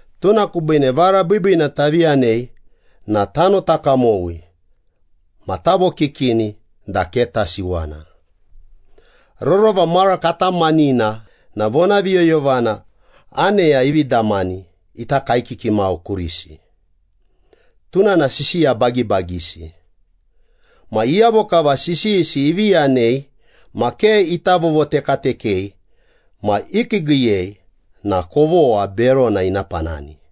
Tuna kubiine vara biibiina tavi yanei na tanota kamowi ma tavokikini da ke tasiwana. Rorova mara katamanina na vonaviyoyovana aneya ivi damani ita kaekiki mau kurisi, tuna na sisiya bagibagisi. Ma iyavo kava sisiyisi ivi yanei ma ke ita vovotekatekei ma ikiigiiyei na kovogha berona ina panani.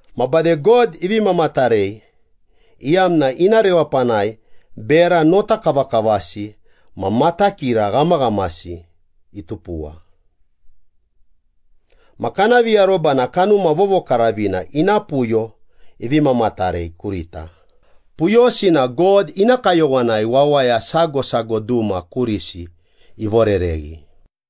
Ma bade God ivi mamatarei, iyamna ina rewapanai bera notakavakavasi ma matakira ghamaghamasi itupuwa. Ma kana viaroba na Kanuma Vovokaravina ina puyo ivi mamatarei kurita, puyosi na God ina kayowanai wawaya sago sago duma kurisi ivorereghi.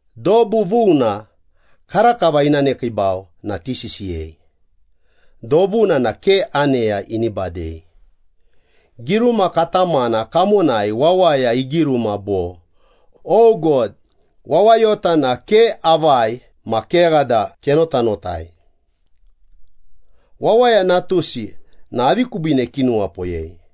Dobu vuna karakava ina nekiibau na tisisiyei, dobuna na ke aneya ini badei. Giruma katamana kamonai wawaya igiruma bo, “O God, wawayota na ke avai ma kegha da kenotanotai, wawaya natusi na avi kubiine kinuwapoyei?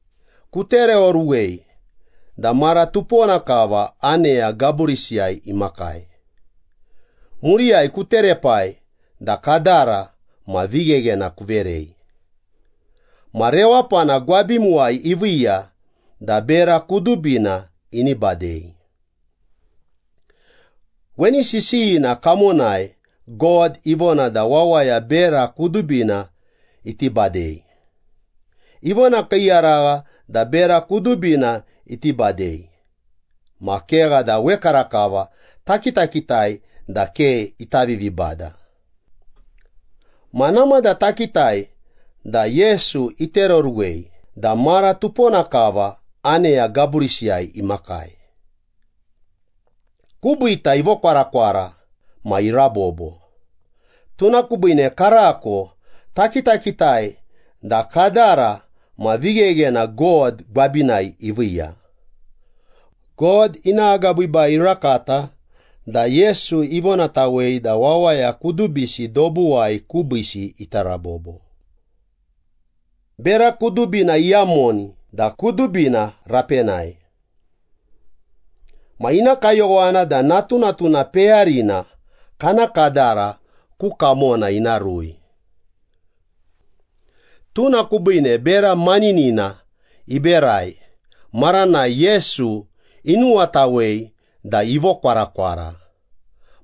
Kutereoruwei da mara tupona kava aneya gaburisiyai imakai. Muriyai kuterepai da kadara ma vigheghena kuverei. Ma rewapana gwabimuwai iviiya da bera kudubina ini badei.” Weni sisiyina kamonai God ivona da wawaya bera kudubina iti badei. Ivonakiiyaragha da bera kudubina iti badei, ma kegha da wekarakava takitakitai da ke ita vivibada. Ma namada takitai da Yesu itereoruwei da mara tupona kava aneya gaburisiyai imakai. Kubiita ivokwarakwara ma irabobo, tuna kubiine karako takitakitai da kadara ma vigheghena God gwabinai iviiya. God ina agabiibai irakata da Yesu ivonatawei da wawaya kudubisi dobuwai kubiisi ita rabobo. Bera kudubina iyamoni da kudubina rapenai. Ma ina kayowana da natunatuna peyarina kana kadara ku kamona ina rui. Tuna kubiine bera maninina iberai maranai Yesu inuwatawei da ivokwarakwara,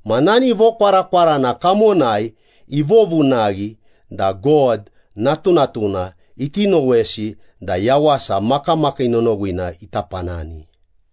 ma nani vokwarakwarana kamonai ivovunaghi da God natunatuna iti nowesi da yawasa makamakii nonowina ita panani.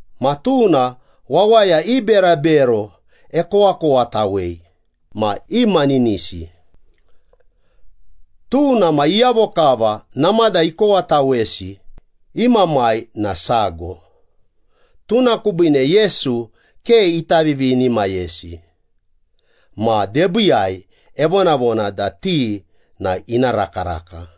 Ma tuna wawaya i berabero ekowakowatawei ma imaninisi. Tuna ma iyavo kava namada ikowatawesi, i Mamai na sago. Tuna kubiine Yesu ke ita vivinimayesi ma debiiyai evonavona da ti na ina rakaraka.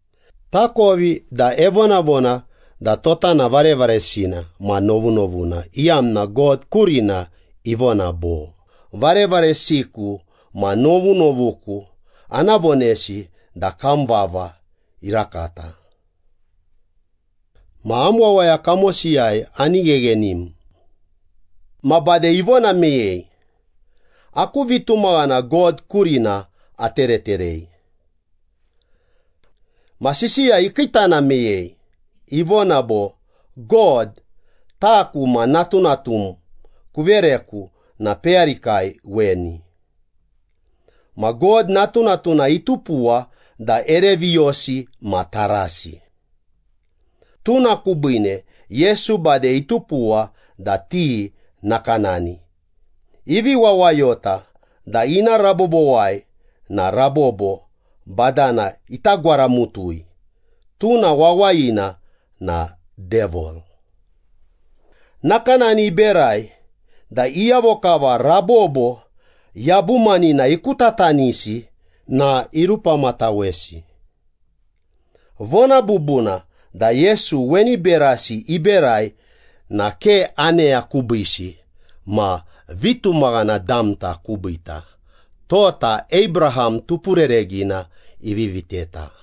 Takovi da evonavona da tota na varevaresina ma novunovuna, iyamna God kurina ivona bo, “Varevaresiku ma novunovuku ana vonesi da kam vava irakata. Ma am wawaya kamosiyai ani gheghenim.” Ma bade ivona meyei, “Aku vitumaghana God kurina atereterei.” Ma sisiya ikiitana meyei, ivona bo, “God, taku ma natunatum kuvereku na peyarikai weni.” Ma God natunatuna itupuwa da ere viyosi ma tarasi. Tuna kubiine Yesu bade itupuwa da ti nakanani, ivi wawayota da ina rabobowai na rabobo badana ita gwaramutui, tuna wawayina na Devil. Nakanani iberai da iyavo kava rabobo yabumanina ikutatanisi na irupamatawesi. Vona bubuna da Yesu weni berasi iberai na ke aneya kubiisi ma vitumaghana damta kubiita, tota Abraham tupurereghina ivi viteta.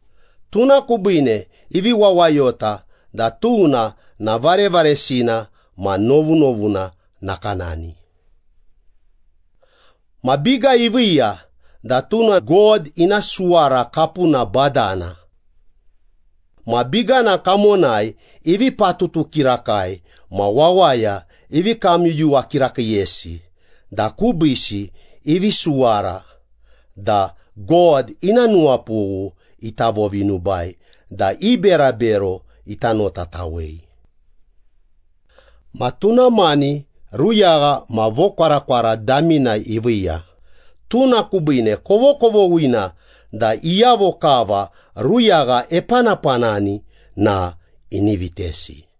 Tuna kubiine ivi wawayota da tuna na varevaresina ma novunovuna nakanani. Ma biga iviiya da tuna God ina suwara kapuna badana. Ma bigana kamonai ivi patutu kirakai ma wawaya ivi kamyuyuwa kirakiiyesi da kubiisi ivi suwara da God ina nuwapughu ita vovinubai da i berabero ita notatawei. Ma tuna mani ruyagha ma vokwarakwara damina iviiya, tuna kubiine kovokovoghina da iyavo kava ruyagha epanapanani na ini vitesi.